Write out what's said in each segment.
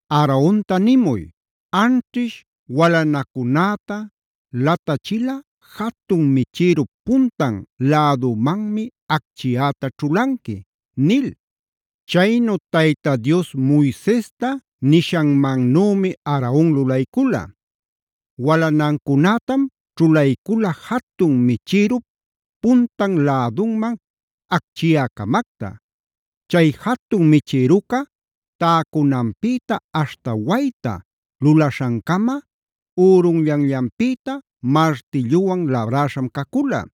“Aaronta nimuy: ‘Anćhish walanacunäta latachilꞌa jatun michïrup puntan lädumanmi acchiyäta ćhulanqui’” nil. Chaynu Tayta Dios Moisesta nishanmannümi Aaron lulaycula; walanancunätam ćhulaycula jatun michïrup puntan lädunman acchiyä-camacta. Chay jatun michïruca täcunanpïta aśhta wayta lulaśhancama ürunllanllanpïta martilluwan labräśham cacula.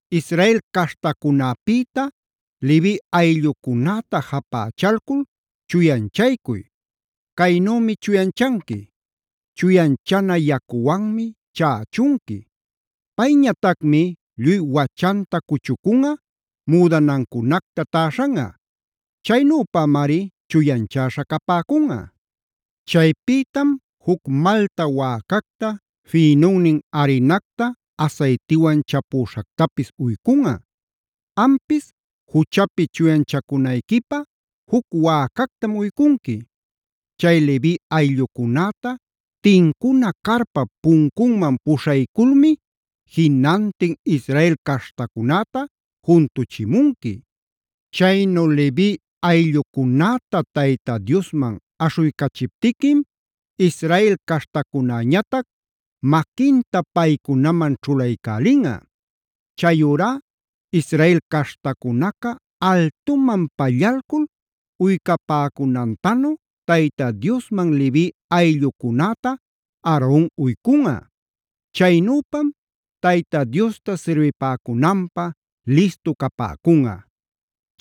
“Israel caśhtacunäpïta Levi ayllucunäta japächalcul chuyanchaycuy. Caynümi chuyanchanqui: chuyanchana yacuwanmi chächunqui. Payñatacmi lluy wachanta cuchucunꞌa, müdanancunacta täśhanꞌa. Chaynüpamari chuyanchäśha capäcunꞌa. Chaypïtam juc malta wäcacta, fïnunnin arinacta asaytiwan chapüśhactapis uycunꞌa. Ampis juchapi chuyanchacunayquipä juc wäcactam uycunqui. Chay Levi ayllucunäta tincuna carpap puncunman puśhayculmi jinantin Israel caśhtacunäta juntuchimunqui. Chaynu Levi ayllucunäta Tayta Diosman aśhuycachiptiquim Israel caśhtacunäñatac maquinta paycunaman ćhulaycälinꞌa. Chayurá Israel caśhtacunaca altuman pallalcul uycapäcunantanu Tayta Diosman Levi ayllucunäta Aaron uycunꞌa. Chaynüpam Tayta Diosta sirbipäcunanpä listu capäcunꞌa.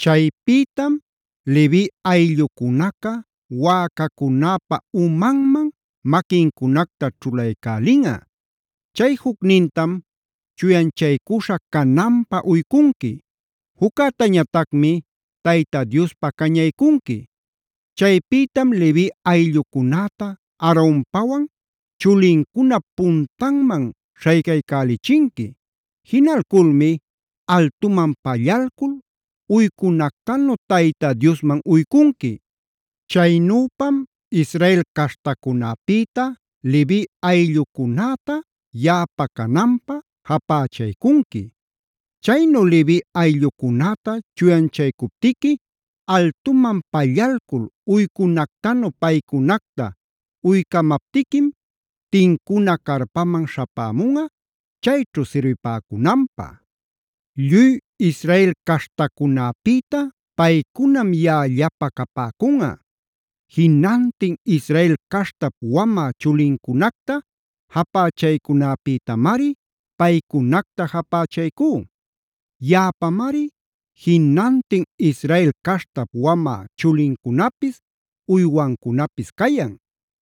“Chaypïtam Levi ayllucunaca wäcacunäpa umanman maquincunacta ćhulaycälinꞌa. Chay jucnintam chuyanchaycuśha cananpä uycunqui; juccätañatacmi Tayta Diospä cañaycunqui. Chaypïtam Levi ayllucunäta Aaronpawan chulincunap puntanman śhaycaycälichinqui. Jinalculmi altuman pallalcul uycunactanu Tayta Diosman uycunqui. Chaynüpam Israel caśhtacunäpïta Levi ayllucunäta yaꞌapa cananpä japächaycunqui. “Chaynu Levi ayllucunäta chuyanchaycuptiqui, altuman pallalcul uycunactanu paycunacta uycamaptiquim tincuna carpaman śhapämunꞌa, chayćhu sirbipäcunanpä. Lluy Israel caśhtacunäpïta paycunam yaꞌallapä capäcunꞌa. Jinantin Israel caśhtap wamä chulincunacta japächaycunapïtamari paycunacta japachaycú. Yaꞌapamari jinantin Israel caśhtap wamä chulincunapis, uywancunapis cayan.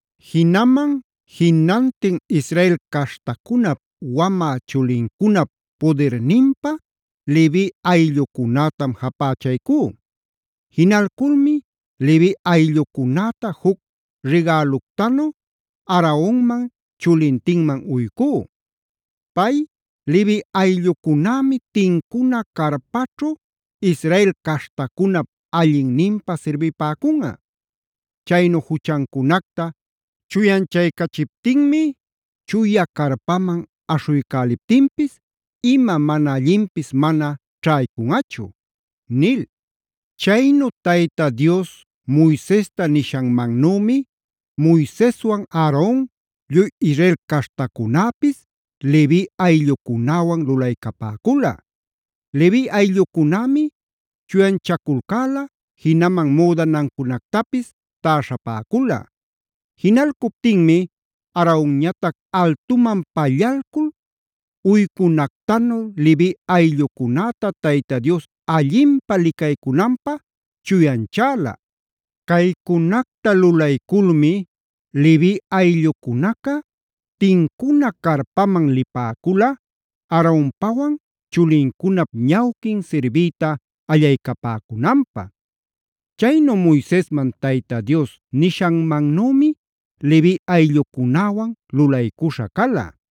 Jinaman jinantin Israel caśhtacunap wamä chulincunap pudirninpä Levi ayllucunätam japachaycú. Jinalculmi Levi ayllucunäta juc rigäluctanu Aaronman chulintinman uycú. Pay Levi ayllucunämi tincuna carpaćhu Israel caśhtacunap allinninpä sirbipäcunꞌa. Chaynu juchancunacta chuyanchaycachiptinmi chuya carpaman aśhuycäliptinpis ima mana allinpis mana ćhaycunꞌachu” nil. Chaynu Tayta Dios Moisesta nishanmannümi Moiseswan Aaron, lluy Israel caśhtacunäpis Levi ayllucunäwan lulaycapäcula. Levi ayllucunämi chuyanchaculcäla, jinaman müdanancunactapis täśhapäcula. Jinalcuptinmi Aaronñatac altuman pallalcul uycunactanu Levi ayllucunäta Tayta Dios allinpä licaycunanpä chuyanchäla. Caycunacta lulayculmi Levi ayllucunaca tincuna carpaman lipäcula Aaronpawan chulincunap ñawquin sirbiyta allaycapäcunanpä. Chaynu Moisesman Tayta Dios nishanmannümi Levi ayllucunäwan lulaycuśha cala.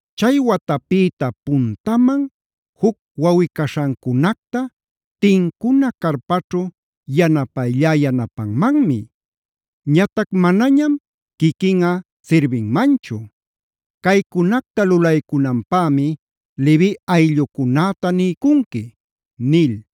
Chay watapïta puntaman juc wawꞌi-caśhancunacta tincuna carpaćhu yanapayllá yanapanmanmi. Ñatac manañam quiquinꞌa sirbinmanchu. Caycunacta lulaycunanpämi Levi ayllucunäta niycunqui” nil.